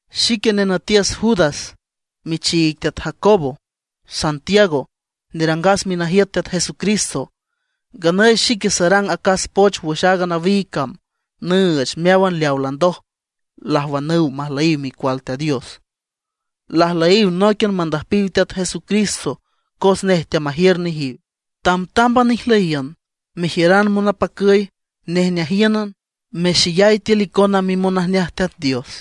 Xique nenütiüs Judas michiig Teat Jacobo (Santiago), nerangas minajiüt Teat Jesucristo. Nganüy xique sarang acas poch wüx aaga nawiig cam nüüch meáwan leawa landoj lajwanüw majlüyiw micual Teat Dios, lajlüyiw nóiquian mandüjpiw Teat Jesucristo cos nej teamajiür nejiw. Tamtámban ijlüyiün, mejiüran monapacüy, nejneajíünan, mexeyay tiül icona mimonajneaj Teat Dios.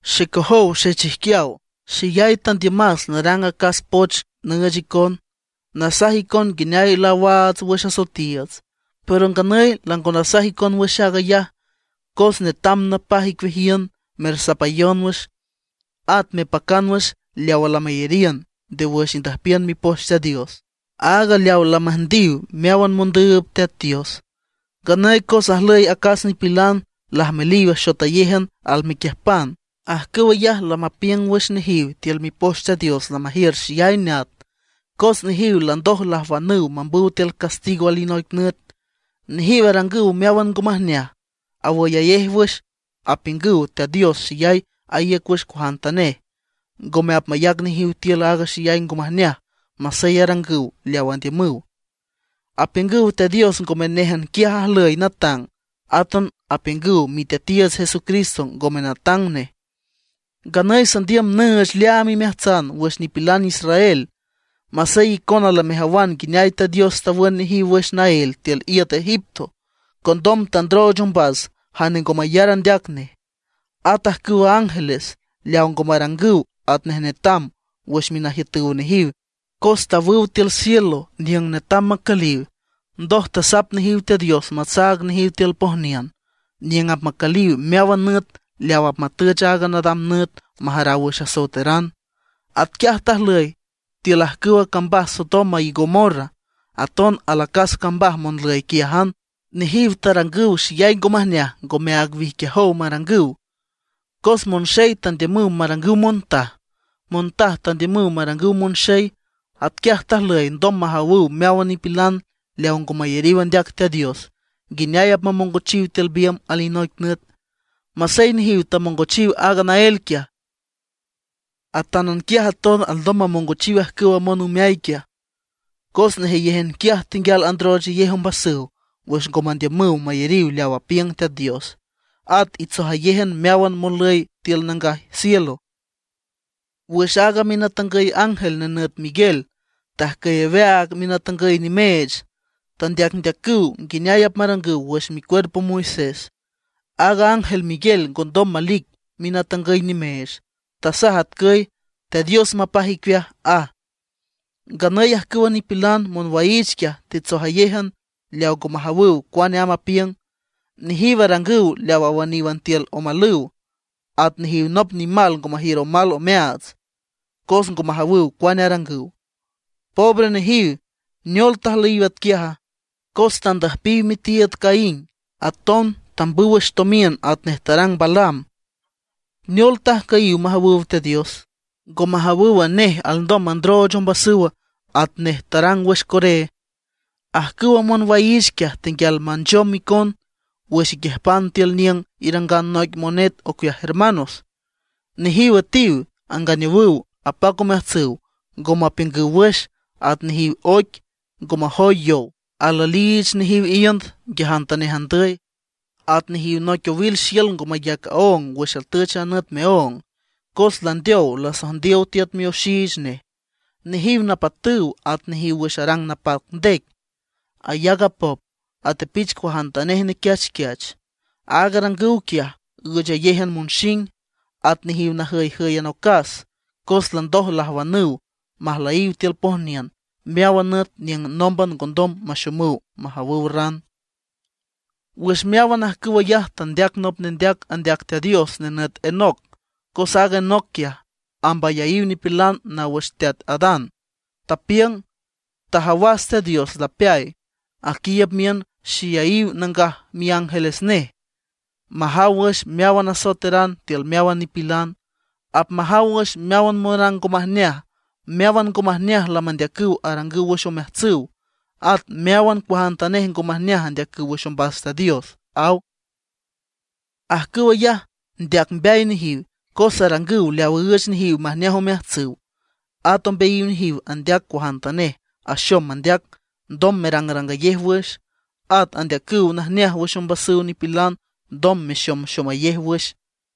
Xecojow xechijquiaw, xeyay tandiümas narang acas poch nüüch icon, nasaj icon nguineay laawaats wüx asoetiiüts. Pero nganüy lango nasaj icon wüx aag ayaj, cos netam napaj icueajiün mersapayon wüx, at mepacan wüx leawa lameyariün nde wüx indüjpiün Mipoch Teat Dios, áag leawa lamüjndiw meáwan mondüüb Teat Dios. Nganüy cos ajlüy acas nipilan lajmeliw axotayéjan almequiüjpan. Ajcüw ayaj lamapiüng wüx nejiw tiül Mipoch Teat Dios lamajiür xeyay neat. Cos nejiw landoj lajwanüw mambüw tiül castigo alinoic nüt. Nejiw arangüw meáwan ngo majneaj; awüyayej wüx apiüngüw Teat Dios xeyay aíüc wüx cuajantanej, ngome apmayac nejiw tiül aaga xeyay ngo majneaj masey arangüw leaw andiümüw. Apiüngüw Teat Dios ngome néjan quiaj ajlüy natang; átan apiüngüw Miteatiiüts Jesucristo ngome natang nej. Nganüy sandiüm nüüch leaam imeajtsan wüx nipilan israel, masey icona lamejawan nguineay Teat Dios tawün nejiw wüx naél tiül iüt Egipto; condom tandrooch ombas jane ngo mayar andeac nej. At ajcüwa ángeles, leaw ngo marangüw atnej netam wüx minajiütüw nejiw cos tawüw tiül cielo niüng netam macüliw. Ndoj tasap nejiw Teat Dios matsaag nejiw tiül noic pojniün, niüng apmacüliw meáwan nüt leaw apmatüch aaga nadam nüt majaraw wüx asoeteran. Atquiaj tajlüy tiül ajcüwa cambaj Sodoma y Gomorra, aton alacas cambaj monlüy quiájan. Nejiw tarangüw xeyay ngo majneaj ngomeaag wijquiajow marangüw. Cos monxey tandiümüw marangüw montaj, monjtaj tandiümüw marangüw monxey. Atquiaj tajlüy ndom majawüw meáwan nipilan leaw ngo mayariw andeac Teat Dios nguineay apmamongochiw tiül biümb alinoic nüt. Masey nejiw tamongochiw aaga naél quiaj, atanquiaj aton alndom mamongochiw ajcüwa monümeay quiaj. Cos nejeyéjan quiaj tenguial androochayej ombasüw wüx ngo mandiümüw mayariw leaw apiüng Teat Dios. At itsojayéjan meáwan monlüy tiül nangaj cielo. Wüx aaga minatangüy ángel nenüt Miguel tajcüy aweaag minatangüy nimeech, tandeacndeacüw nguineay apmarangüw wüx micuerpo Moisés. Aaga ángel Miguel ngo ndom malic minatangüy nimeech. Tasaj atcüy: “Teat Dios mapaj icueaj”, aj. Nganüy ajcüwa nipilan monwaiich quiaj itsojayéjan leaw ngo majawüw cuane amb apiüng. Nejiw arangüw leaw awüníwan tiül omalüw, at nejiw nop nimal ngo majiür omal omeaats, cos ngo majawüw cuane arangüw. ¡Pobre nejiw! ¿Neol tajlüyiw atquiaja? Cos tandüjpiw mitiiüd Caín, aton tambüw wüx tomiün atnej tarang Balaam. ¿Neol tajcüyiw majawüw Teat Dios? ¿Ngo majawüwa, nej alndom mandrooch ombasüw atnej tarang wüx Coré? Ajcüwa monwaiich quiaj tenguial manchom icon wüx iquiüjpan tiül niüng irangan noic monet ocueaj hermanos. Nejiw üetiw, anganeowüw, apac omeajtsüw, ngo mapiüngüw wüx. At nejiw oic ngo majoy yow, alüeliich nejiw iünd nguiajantanej andüy. At nejiw noic owil xiül ngo mayac aóng wüx atüch a nüt meóng, cos landeow lasojndiow tiüt mioxiich nej. Nejiw napatüw, at nejiw wüx arang napac ndec, ayac apop, atepich cuajantanej nequiachquiach. Aag arangüw quiaj üüchayéjan monxing. At nejiw najüyjǘyan ocas, cos landoj lajwanüw majlüyiw tiül pojniün meáwan nüt niüng nómban ngondom maxomüw majawüw ran. Wüx meáwan ajcüw ayaj tandeac nop nendeac andeac Teat Dios nenüt Enoc; cos aaga Enoc quiaj, amb ayaíw nipilan naw wüx teat Adán. Tapiüng: “Tajawas Teat Dios lapeay, aquiiüb miün xeyayiw nangaj miángeles nej, majaw wüx meáwan asoeteran tiül meáwan nipilan. Apmajaw wüx meáwan monrang ngo majneaj, meáwan ngo majneaj lamandeacüw arangüw wüx omeajtsüw; at meáwan cuajantanej ngo majneaj andeacüw wüx ombas Teat Dios”, aw. Ajcüw ayaj ndeac mbeay nejiw, cos arangüw leaw üüch nejiw majneaj omeajtsüw; at ombeayiw nejiw andeac cuajantanej axom mandeac ndom marangrangayej wüx; at andeacüw najneaj wüx ombasüw nipilan ndom maxomxomayej wüx.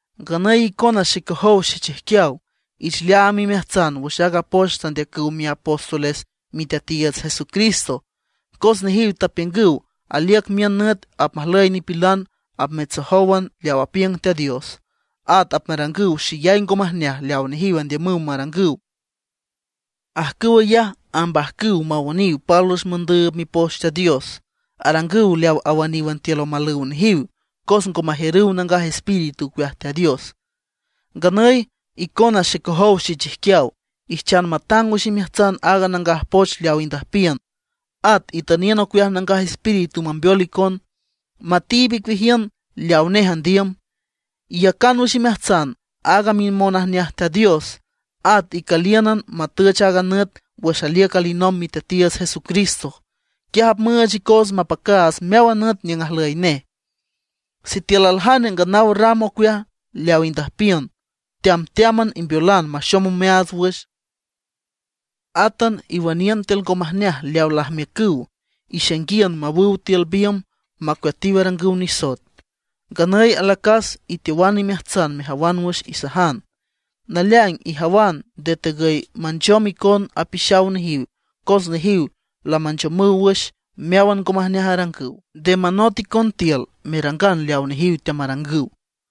Nganüy icona xecojow xechijquiaw, ich leaam imeajtsan wüx aaga poch tandeacüw miapóstoles Miteatiiüts Jesucristo. Cos nejiw tapiüngüw aliüc miün nüt apmajlüy nipilan apmitsojówan leaw apiüng Teat Dios, at apmarangüw xeyay ngo majneaj leaw nejiw andiümüw marangüw. Ajcüw ayaj ambajcüw mawüniw pálwüx mondüüb Mipoch Teat Dios. Arangüw leaw awüníwan tiül omalüw nejiw, cos ngo majiürüw Nangaj Espíritu ocueaj Teat Dios. Nganüy icona xecojow xechijquiaw, ijchan matang wüx imeajtsan aaga nangaj poch leaw indüjpiün. At itüniün ocueaj Nangaj Espíritu mambeol icon, matiib icueajiün leawa nej andiüm. Iyacan wüx imeajtsan aaga mimonajneaj Teat Dios. At icülíünan matüch aaga nüt wüx aliüc alinomb Miteatiiüts Jesucristo. Quiaj apmüüch icoots mapacaats meáwan nüt niüng ajlüy nej. Sitiül aljane nganaw ram ocueaj leaw indüjpiün, teamteáman imbeolan maxom omeaats wüx. Átan iwüniün tiül ngo majneaj leawa lajmiücüw, ixainguiün mawüw tiül biümb macueatiw arangüw nisoet. Nganüy alacas iteowan imeajtsan mejawan wüx isajan; naleaing ijawan nde tegüy manchom icon apixaw nejiw cos nejiw lamanchomüw wüx meáwan ngo majneaj arangüw, nde manot icon tiül merangan leaw nejiw teamarangüw.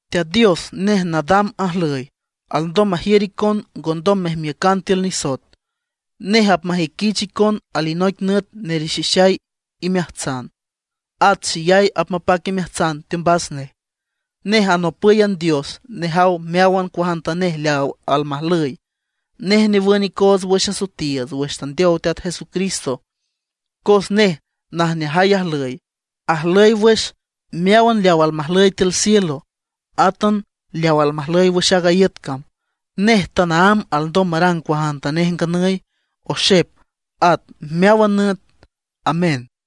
Teat Dios nej nadam ajlüy, alndom majiür icon ngondom mejmiücan tiül nisoet. Nej apmajüiquich icon alinoic nüt nerixixay imeajtsan, at xeyay apmapac imeajtsan teombas nej. Nej anopǘyan Dios nejaw meáwan cuajantanej leaw almajlüy. Nej newün icoots wüx asoetiiüts wüx tandeow Teat Jesucristo. Cos nej najneajay ajlüy, ajlüy wüx meáwan leaw almajlüy tiül cielo, átan leaw almajlüy wüx aaga iüt cam. Nej tanaámb alndom marang cuajantanej nganüy, oxep, at meáwan nüt. Amén.